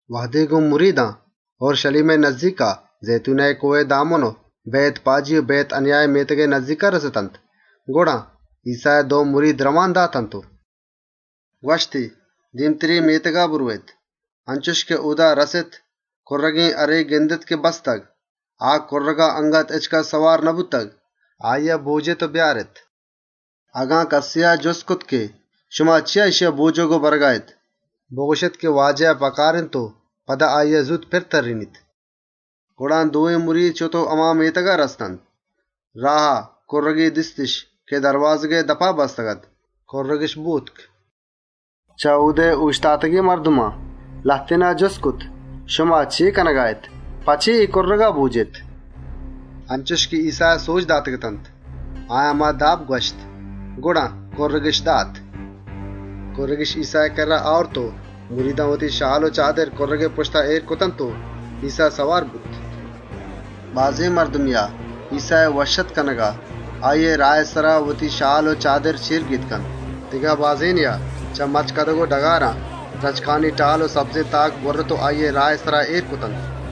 ‏ وهدے اورْشَلیمئے نزّیکا، زئیتونئے کۆهئے دامُنا بئیت‌پاجی و بئیت‌اَنیائے مێتگان رَستنت، گڑا ایسّایا دو مرید رئوان دات و ‏ گوَشتی: «دێمی مێتگا برئوێت. انچُش که اۆدا رَسێت، کُرّگێن هَرے گندێت که بستگ. آ کُرّگا اَنگت هچکَس سوار نبوتگ. آییا بۆجێت و اِدا بیارێت. ‏ اگن کَسێا جُست کرت که: ‹شما چے کنگا اێت،› بگوَشێت که واجها اے کُرّگ پکار اِنت و پدا آییا زوت پِرَ تَرّێنیت.» ‏ گڑا دوێن مرید شت و کُرّگے دیستِش که دَروازگئے دپا بستگ‌اَت. بۆتکِش. ‏ چه اۆدا اۆشتاتگێن مردمان لهتێنا جُست کرت: «شما چے کنگا اێت؟ په چے اے کُرّگا بۆجێت؟» ‏ انچُش که ایسّایا سۆج داتگ‌اتنت، آیان هما داب گوَشت. گڑا، کُرّگِش دات. ‏ کُرّگِش ایسّائے کِرّا آورت و وتی شال و چادرِش کُرّگئے پُشتا اێر کرتنت و ایسّا سوار بوت. ‏ بازێنێا ایسّائے وشّ‌آتک کنگا، آییئے راهئے سرا وتی شال و چادر چێرگێجان کرتنت. دگه بازێنێا، چه مَچکدگ و ڈگاران درچکانی ٹال و تاک بُرِّت و راهئے سرا اێر کرت. ‏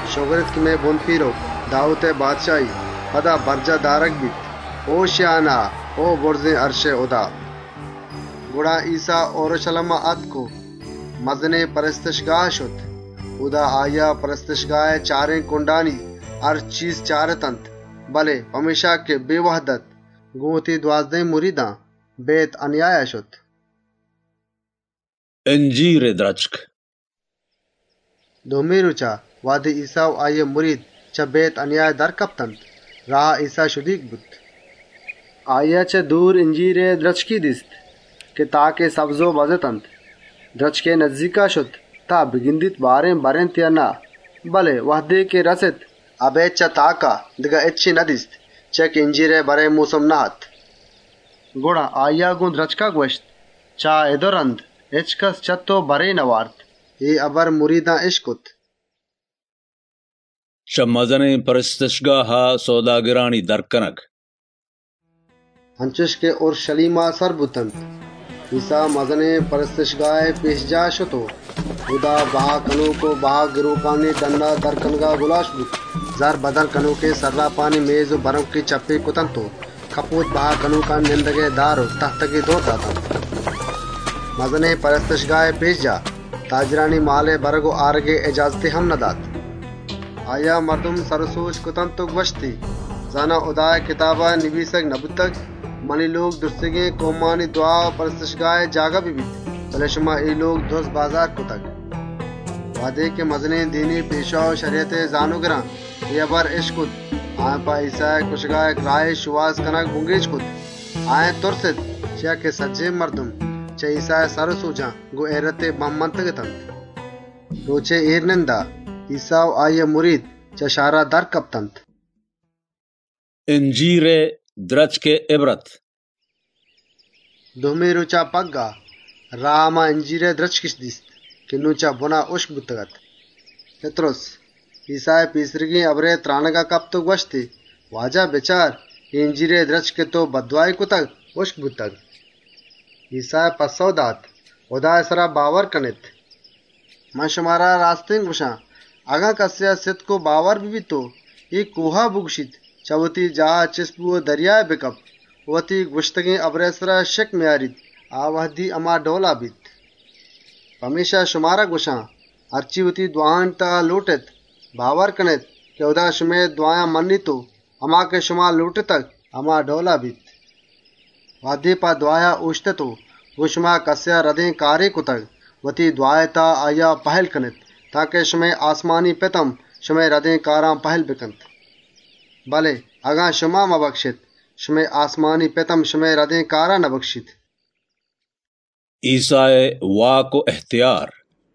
شگر اِنت که مئے بُنپیرُک داوودئے بادشاهی پدا برجاه دارگَ بیت. هوشیانا، بُرزێن اَرشا!» ‏ گڑا ایسّا اورْشَلیما آتک و مزنێن پرستشگاها شت. اۆدا، آییا پرستشگاهئے چارێن کُنڈانی هر چیز چارت. بله پمێشکا که بێوهد اَت، گۆن وتی دوازدهێن مریدان بئیت‌اَنیایا شت. اِنجیرئے درچکئے هُشک بئیگ ‏ دومی رۆچا، وهدے ایسّا و آییئے مرید چه بئیت‌اَنیایا در کپتنت، راها ایسّا شدیگ بوت. ‏ آییا چه دورا اِنجیرئے درچکے دیست که تاکی سبز و بَز اتنت. درچکئے نزّیکا شت تان بگندیت بارێن بَر اِنت یا نه. بله وهدے رَست، اَبێد چه تاکا دگه هچّی ندیست، چیا که اِنجیرئے بَرئے مۆسم نه‌اَت. ‏ گڑا گۆن درچکا گوَشتی: «چه اِد و رَند، هچکَس چه تئو بَرے مئوَرات.» اے هبر مریدان اِشکت. چه مزنێن پرستشگاها سئوداگرانی در کنگ ‏ انچُش که اورْشَلیما سر بوتنت، ایسّا مزنێن پرستشگاهئے پێشجاها شت و اۆدا سئوداگر و گْراکانی گلّێنگ و در کنگا گُلاێش بوت. زَرّ بدل کنۆکێن سَرّاپانی میزّ و بَرۆنکی چپّیگ کرتنت و کپۆت بها کنۆکانی کُرسی و تَهتگی دئور داتنت. ‏ مزنێن پرستشگاهئے پێشجاها، تاجرانی مالئے برگ و آرگئے اجازتی هم ندات. ‏ مردمی سر و سۆج کرتنت و گوَشتی: «زانا، هُدائے کتابا نبیسگ نبوتگ: منی لۆگ سجّهێن کئومانی دْوا و پرستشئے جاگه ببیت، بله شما دُزّبازارے کرتگ.» ‏ وهدے مزنێن دینی پێشوا و شَریَتئے زانۆگران اے هبر اِشکت، آییئے کُشگئے جُهدِش کرت. بله تُرستِش، چیا که سجّهێن مردم چه ایسّائے سر و سۆجان گۆن هئیرتے بَه منتگ‌اتنت. ‏ رۆچئے اێرنندا، ایسّا و آییئے مرید چه شهرا در کپتنت. اِنجیرئے درچکئے اِبرت ‏ دومی رۆچا پَگّاه، راها هما اِنجیرئے درچکِش دیست که نون چه بُنا هُشک بوتگ‌اَت. ‏ پِتْرُس، ایسّائے پێسریگێن هبرئے یات و تْرانَگا کپت و گوَشتی: «واجه! بچار، اے درچک که تئو بددْوایی کرت گیمّرتگ.» ‏ ایسّایا پَسّئو دات: «هُدائے سرا باور کنێت، ‏ شمارا راستێنَ گوَشان، اگن کَسێا سِتک و باور ببیت و اے کۆها بگوَشیت: ‹وتا چه اِدا چِست کن و دریائے تها دئور بدئے› و وتی گوَشتگێن هبرئے سرا شکّ مئیاریت، آ وهدی په آییا انچُشَ بیت. ‏ پمێشکا شمارا گوَشان، هرچے وتی دْوایانی تها لۆٹێت، باور کنێت که هُدا شمئے دْوایانَ مَنّیت و هما که شما لۆٹتگ، هما ڈئولا بیت. ‏ وهدے په دْوایا اۆشتێت و گۆن شما کَسێا گناهے کرتگ، وتی دْوائے تها آییا ببَکشێت تانکه شمئے آسمانی پت هم، شمئے گناه و مئیاران ببَکشیت و پهِلّ بکنت. ‏ بله اگن شما مبکشێت، شمئے آسمانی پت هم شمئے گناه و مئیارانَ نبکشیت.» ایسّائے واک و اِهتیار ‏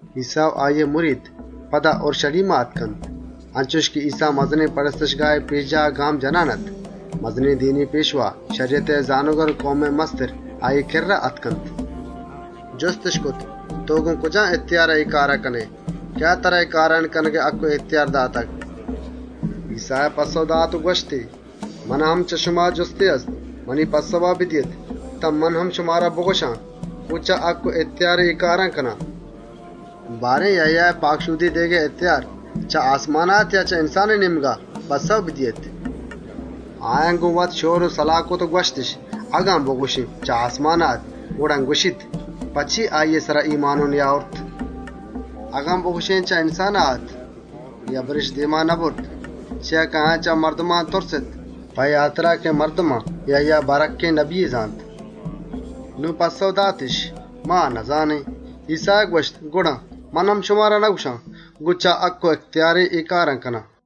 ایسّا و آییئے مرید، پدا اورْشَلیما آتکنت. انچُش که ایسّا مزنێن پرستشگاهئے پێشجاها گام جنان اَت، مزنێن دینی پێشوا، شَریَتئے زانۆگر و کئومئے کماش آییئے کِرّا آتکنت. ‏ جُستِش کرت: «تئو گۆن کجام هَکّ و اِهتیارا اے کارانَ کنئے؟ کئیا ترا اے کارانی کنگئے اِهتیار داتگ؟» ‏ ایسّایا پَسّئو دات و گوَشت: «منا هم چه شما جُستے هست، منی پَسّئوا بدئیێت، تان من هم شمارا بگوَشان گۆن کجام هَکّ و اِهتیارا اے کارانَ کنان. ‏ یَهیایا پاکشۆدی دئیگئے اِهتیار، چه آسمانا رَستگ‌اَت یا چه انسانئے نێمگا؟ پَسّئو بدئیێت!» ‏ آیان وت‌مان‌وتا شئور و سَلاه کرت و گوَشتِش: «اگن بگوَشێن چه آسمانا اَت، گڑا گوَشیت: ‹په چے آییئے سرا ایمانۆ نئیاورت؟› ‏ اگن بگوَشێن چه انسانئے نێمگا اَت... ؟» اے هبرِش دێما نبرت چیا که آیان چه مردمان تُرست، په اے هاترا که مردمان یَهیا بَرهَکّێن نبیے زانت. ‏ پمێشکا پَسّئوِش دات: «ما نزانێن.» ایسّایا گوَشت: «گڑا من هم شمارا نگوَشان که گۆن کجام هَکّ و اِهتیارا اے کارانَ کنان.»